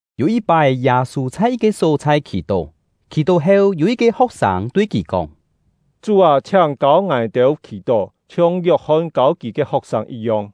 Yû yit-pái, Yâ-sû chhai yit-ke só-chhai khì-tó. Khì-tó heu, yû yit-ke ho̍k-sâng tui kì kóng: “Chú â, chhiáng kâu ngài-têu khì-tó, chhiong Yok-hon kâu kì ke ho̍k-sâng yit-yong.”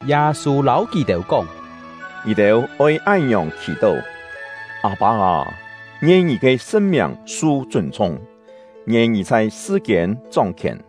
Yâ-sû lâu kì-têu kóng: “Ngì-têu oi án-ngiòng khì-tó: Â-pâ â: Ngien Ngì ke sṳn-miàng su chûn-chhung; ngien Ngì chhai sṳ-kiên chóng-khièn.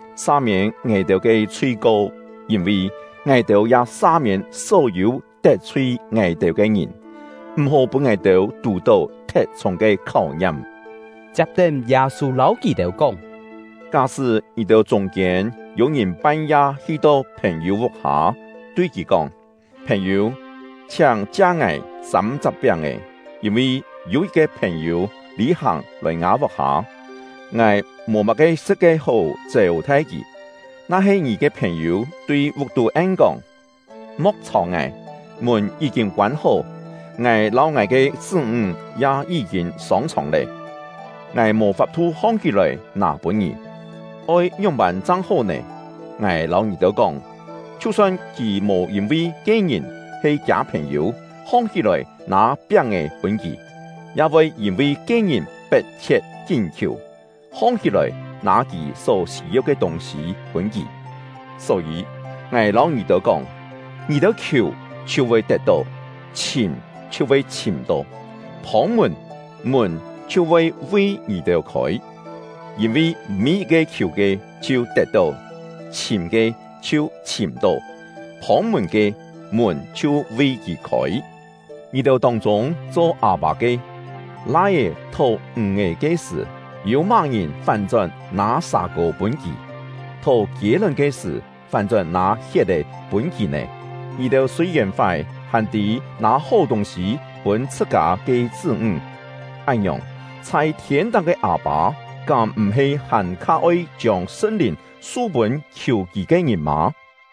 Sa-miên ngài-têu ke chhui-ko, yîn-vi ngài-têu ya sa-miên só-yû tet-chhui “tet-chhui” ya-he yi̍t-cho “khûi-khiam”. ngài-têu ke ngìn. M̀-hó pûn ngài-têu tù-tó thet-chhûng ke kháu-ngiam.” Chiap-tén, Yâ-sû lâu kì-têu kóng: “Ká-sṳ́ ngì-têu chûng-kiên yû-ngìn pan-ya hi-to phèn-yû vuk-hâ, tui kì kóng: ‘Phèn-yû, chhiáng chia ngài sâm-chak piáng-è; yîn-vi yû yit-ke phèn-yû lî-hàng lòi ngâ vuk-hâ, ngài mò má-ke sṳ̍t ke hó chêu-thai kì.’ Na-he ngì ke phèn-yû tui vuk-tú en-kóng: ‘Mo̍k chhàu ngài! Mùn yí-kîn koân-hó, ngài lâu ngài ke chṳ́-ńg ya yí-kîn sông-chhòng lé, ngài mò fap-thu hong-hí-lòi nâ pûn ngì.’ Oi ngióng-pân chang hó nè? Ngài lâu ngì-têu kóng, chhiu-son kì mò yîn-vi ke-ngìn he kiâ phèn-yû, hong-hí-lòi nâ piáng-è pûn kì, ya voi yîn-vi ke-ngìn pet-chhiet kín khiù, hong-hí-lòi nâ kì só sî-yeu ke tûng-sî pûn kì. “Só-yî, ngài lâu ngì-têu kóng: Ngì-têu khiù, chhiu voi tet-tó; chhìm, chhiu voi chhìm-tó; phông-mùn, mùn chhiu voi vi ngì-têu khôi. Yîn-vi mî-yit-ke khiù ke, chhiu tet-tó; chhìm ke, chhiu chhìm-tó; phông-mùn ke, mùn chhiu vi kì khôi. Ngì-têu tông-chûng cho â-pâ ke, lai-é thó ǹg-è ke sṳ̀, yû má-ngìn fán-chón nâ sà-kô pûn kì? Thó kiê-lón ke sṳ̀, fán-chón nâ hiet-è pûn kì nè? Ngì-têu sûi-yèn fái, hàn tî nâ hó tûng-sî pûn chhṳ-kâ ke chṳ́-ńg; án-ngiòng, chhai thiên-táng ke Â-pâ kám m̀-he hàn-kha oi chiông Sṳn-Lìn su-pûn khiù Kì ke ngìn mâ?”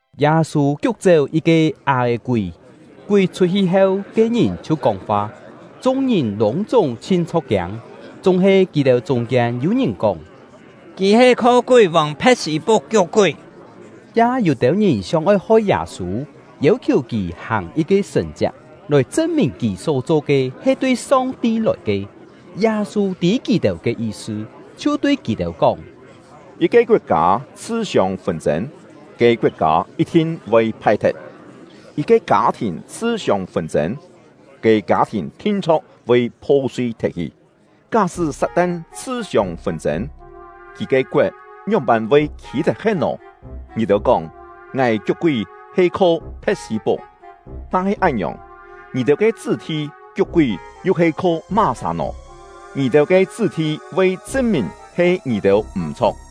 Yâ-sû kiuk-chéu yit-ke á-è-kúi, kúi chhut-hi heu, ke-ngìn chhiu kóng-fa. Chung-ngìn lûng-chúng chhin chho̍k-kiâng, chúng-he kì-têu chûng-kiên yû-ngìn kóng: “Kì he kho kúi-vòng Phe̍t-sî-puk kiuk-kúi.” Ya yû-têu ngìn sióng-oi hoi Yâ-sû, yêu-khiù kì hàng yit-ke sṳ̀n-chiak, lòi chṳn-mìn kì só cho ke he tui Song-ti lòi ke. Yâ-sû tî kì-têu ke yi-sṳ, chhiu tui kì-têu kóng: “Yit-ke koet-kâ chhṳ-siông fûn-chên, ke koet-kâ yit-thin voi phai-thet. Yit-ke kâ-thìn chhṳ-siông fûn-chên, ke kâ-thìn thin-chho̍k voi pho-sui thet-hi. Ká-sṳ́ Sat-tan chhṳ-siông fûn-chên, kì ke koet ngióng-pân voi khî tet-he̍t nò? Ngì-têu kóng ngài kiuk-kúi he kho Phe̍t-sî-puk. Na-he án-ngiòng, ngì-têu ke chṳ́-thi kiuk-kúi yu he kho má-sà nò? Ngì-têu ke chṳ́-thi voi chṳn-mìn he ngì-têu m̀-chho̍k!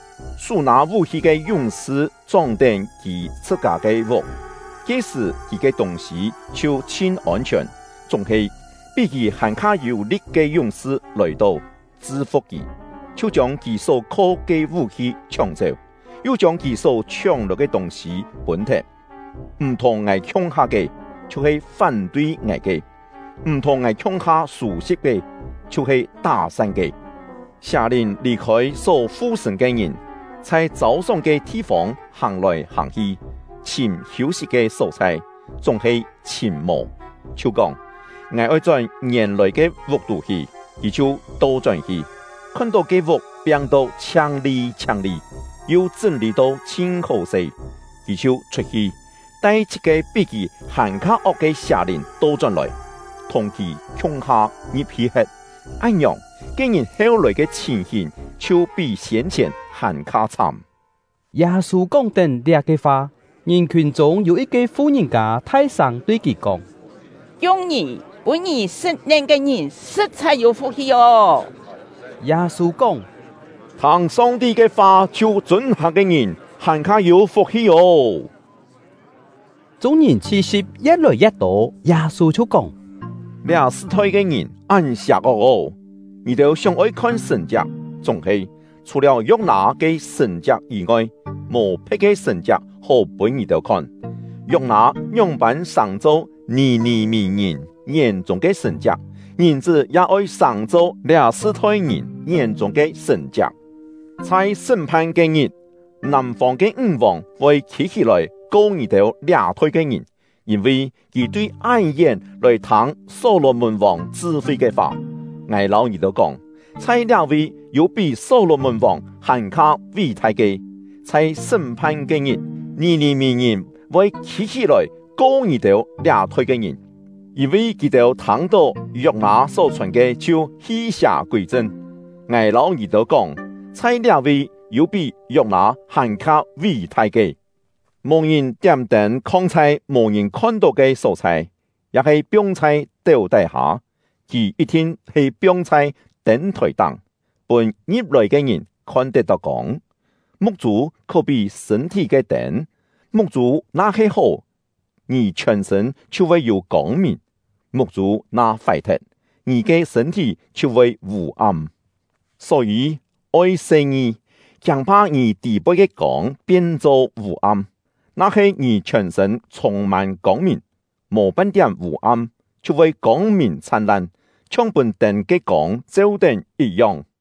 “Sú nâ vú-hi ke yúng-sṳ chóng-tén kì chhṳ-kâ ke vuk, ke-sṳ̀ kì ke tûng-sî chhiu chhin ôn-chhiòn. Chúng-he, pí kì hàn-kha yû-li̍t ke yúng-sṳ lòi-to, chṳ-fu̍k kì, chhiu chiông kì só-kho ke vú-hi chhióng-chéu, yu chiông kì só chhióng-lòi ke tûng-sî pûn-thet. “M̀ thùng ngài khiung-ha ke, chhiu-he fán-tui ngài ke; m̀ thùng ngài khiung-ha sû-si̍p ke, chhiu-he tá-san ke. “Sià-lìn lì-khôi só fu-sṳ̂n ke ngìn, chhai châu-sóng ke thi-fông hàng-lòi hàng-hi, chhìm hiû-sit ke só-chhai, chúng-he chhìm mò, chhiu kóng: ‘Ngài oi chón ngièn-lòi ke vuk-tú hi.’ Kì chhiu to-chón hi, khon-tó ke vuk piang-to chhiang-li chhiang-li, yu chṳ́n-lî to chhin hó-se. Kì chhiu chhut-hi, tai chhit-ke pí kì hàn-kha ok ke sià-lìn to-chón-lòi, thùng kì khiung-ha ngi̍p-hi he̍t. Án-ngiòng, ke-ngìn heu-lòi ke chhìn-hìn chhiu pí siên-chhièn hàn-kha chhám.” Yâ-sû kóng-tén liá-ke fa, ngìn-khiùn chûng yû yit-ke fu-ngìn-kâ thai-sâng tui kì kóng: “Kiung ngì, pûn ngì sṳ̍t-nen ke ngìn, sṳ̍t-chhai yû fuk-hi ô!” Yâ-sû kóng: “Thâng Song-ti ke fa chhiu chûn-hàng ke ngìn, hàn-kha yû fuk-hi ô!” Chung-ngìn chhi-si̍p ye̍t-lòi ye̍t-tô, Yâ-sû chhiu kóng: “Liá sṳ-thoi ke ngìn án sià-ok ô! Ngì-têu sióng-oi khon sṳ̀n-chiak, chúng-he, chhù-liáu Yok-nâ ke sṳ̀n-chiak yî-ngoi, mò phe̍t ke sṳ̀n-chiak hó pûn ngì-têu khon. Yok-nâ ngióng-pân sàng-cho Nì-nì-mì-ngìn ngién-chûng ke sṳ̀n-chiak, Ngìn-chṳ́ ya oi sàng-cho liá sṳ-thoi ngìn ngién-chûng ke sṳ̀n-chiak. Chhai sṳ́m-phan ke-ngit, nàm-fông ke ńg-vòng voi khî-hí-lòi ko ngì-têu liá-thoi ke ngìn, yîn-vi kì tui án-yén lòi thâng Só-lò-mùn-vòng chṳ-fi ke fa. Ngài lâu ngì-têu kóng, chhai liá-vi yû pí Só-lò-mùn-vòng hàn-kha ví-thai ke. Chhai sṳ́m-phan ke-ngit, Nì-nì-mì-ngìn voi khî-hí-lòi ko ngì-têu liá-thoi ke ngìn, yîn-vi kì-têu thâng-tó Yok-nâ só-chhòn ke chhiu hi-sià kûi-chṳn. Ngài lâu ngì-têu kóng, chhai liá-vi yû pí Yok-nâ hàn-kha ví-thai ke. “Mò ngìn tiám-tên khong chhai mò ngìn khon-tó ke só-chhai, ya-he piong chhai téu tái-hâ; kì yit-thin he piong chhai tên-thòi-táng, pûn ngi̍p-lòi ke ngìn khon-tet-tó kông. Muk-chû khó-pí sṳ̂n-thí ke tên. Muk-chû na-he hó, ngì chhiòn-sṳ̂n chhiu voi yû kông-mìn; muk-chû na fái-thet, ngì ke sṳ̂n-thí chhiu voi vû-am. Só-yî, oi se-ngi, kiâng-pha ngì tî-poi ke kông pien-cho vû-am. Na-he ngì chhiòn-sṳ̂n chhûng-mân kông-mìn, mò pan-tiám vû-am, chhiu voi kông-mìn chhan-lan, chhiong pûn tên ke kông cheu-tén yit-yong.”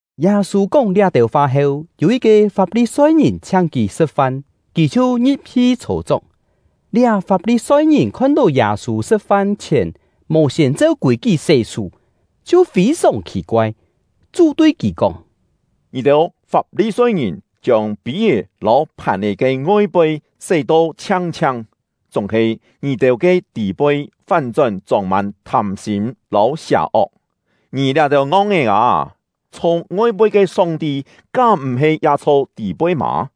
Yâ-sû kóng liá-têu fa heu, yû yit-ke Fap-li-soi-ngìn chhiáng kì sṳ̍t-fan; kì chhiu ngi̍p-hi chhô-chok. Liá Fap-li-soi-ngìn khon-tó Yâ-sû sṳ̍t-fan chhièn mò siên cheu kûi-kí sé-sú, chhiu fî-sòng khì-koai. Chú tui kì kóng: “Ngì-têu Fap-li-soi-ngìn chiông pî-é lâu phàn-è ke ngoi-poi sé-to chhiang-chhiang, chúng-he ngì-têu ke tî-poi fán-chón chông-mân thâm-sîm lâu sià-ok. Ngì liá-têu ngong-é â, chho ngoi-poi ke Song-ti kám m̀-he ya chho tî-poi mâ?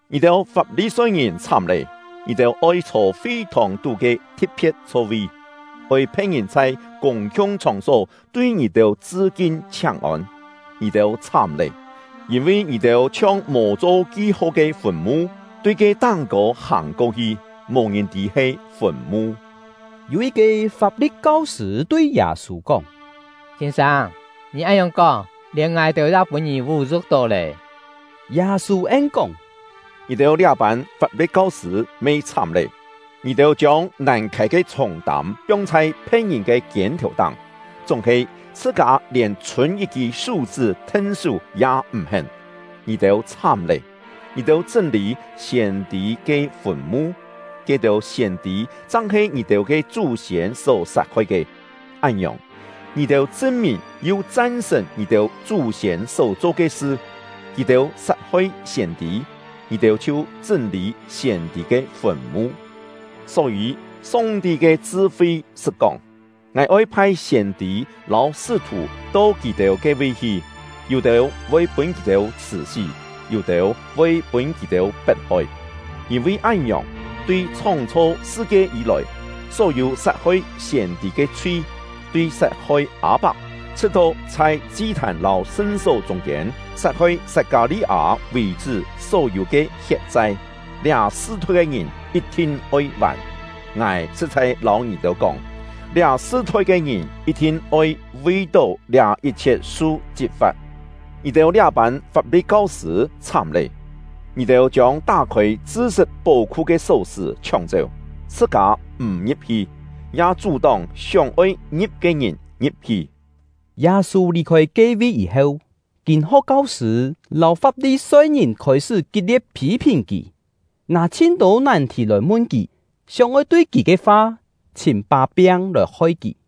“Ngì-têu Fap-li-soi-ngìn chhám lé! Ngì-têu oi chhô fi-thòng-tú ke thi̍t-phe̍t chho-vi, oi phe̍t-ngìn chhai kûng-khiung chhòng-só tui ngì-têu chṳ-kin chhiáng-ôn. Ngì-têu chhám lé! Yîn-vi ngì-têu chhiong mò cho ki-ho ke fùn-mu, tui ke táng-kô hàng-ko-hi, mò-ngìn tî he fùn-mu.” Yû yit-ke Fap-li̍t kau-sṳ̂ tui Yâ-sû kóng: “Sîn-sâng, ngì án-ngiòng kóng, lièn ngài-têu ya pûn ngì vú-yu̍k-tó lé!” Yâ-sû en-kóng: “Ngì-têu liá-pân Fap-li̍t kau-sṳ̂ me chhám lé! Ngì-têu chiông nàn khâi ke chhûng-tâm piong chhai phe̍t-ngìn ke kiên-thèu-táng, chúng-he chhṳ-kâ lièn chhûn yit-kî sú-chṳ́ then-sú ya m̀ hén. Ngì-têu chhám lé! Ngì-têu chṳ́n-lî siên-tî ke fùn-mu, ke-têu siên-tî chang he ngì-têu ke chú-siên só sat-hoi ke. Án-ngiòng, ngì-têu chṳn-mìn yu chan-sṳ̀n ngì-têu chú-siên só-cho ke sṳ; kì-têu sat-hoi siên-tî, ngì-têu chhiu chṳ́n-lî siên-tî ke fùn-mu. Só-yî, Song-ti ke Chṳ-fi sṳt kóng: ‘Ngài oi phai siên-tî lâu sṳ́-thù to kì-têu ke-vi hi; yû-têu voi pûn kì-têu chhṳ̀-sí, yû-têu voi pûn kì-têu pet-hoi.’ Yîn-vi án-ngiòng, tui chhóng-chho sṳ-kie yî-lòi, só-yû sat-hoi siên-tî ke chhui, tui sat-hoi Â-pak, chhṳ̍t-to chhai chi-thàn lâu sṳn-só chûng-kiên sat-hoi Sat-kâ-li-â vì-chṳ́ só-yû ke hiet-chai, liá sṳ-thoi ke ngìn yit-thin oi vàn. Ngài sṳ̍t-chhai lâu ngì-têu kóng, liá sṳ-thoi ke ngìn yit-thin oi vi-tó liá yit-chhiet su chit-fa̍t! “Ngì-têu liá-pân Fap-li̍t kau-sṳ̂ chhám lé! Ngì-têu chiông tá-khôi chṳ-sṳt pó-khu ke só-sṳ̀ chhióng-chéu, chhṳ-kâ m̀ ngi̍p-hi, ya chú-tóng sióng-oi ngi̍p ke ngìn ngi̍p-hi!” Yâ-sû lì-khôi ke-vi yî-heu, kîn-ho̍k kau-sṳ̂ lâu Fap-li-soi-ngìn khôi-sṳ́ kit-lie̍t phî-phìn kì, nâ chhin-tô nàn-thì lòi mun kì, sióng-oi tui kì ke fa chhìm pá-piang lòi hoi kì.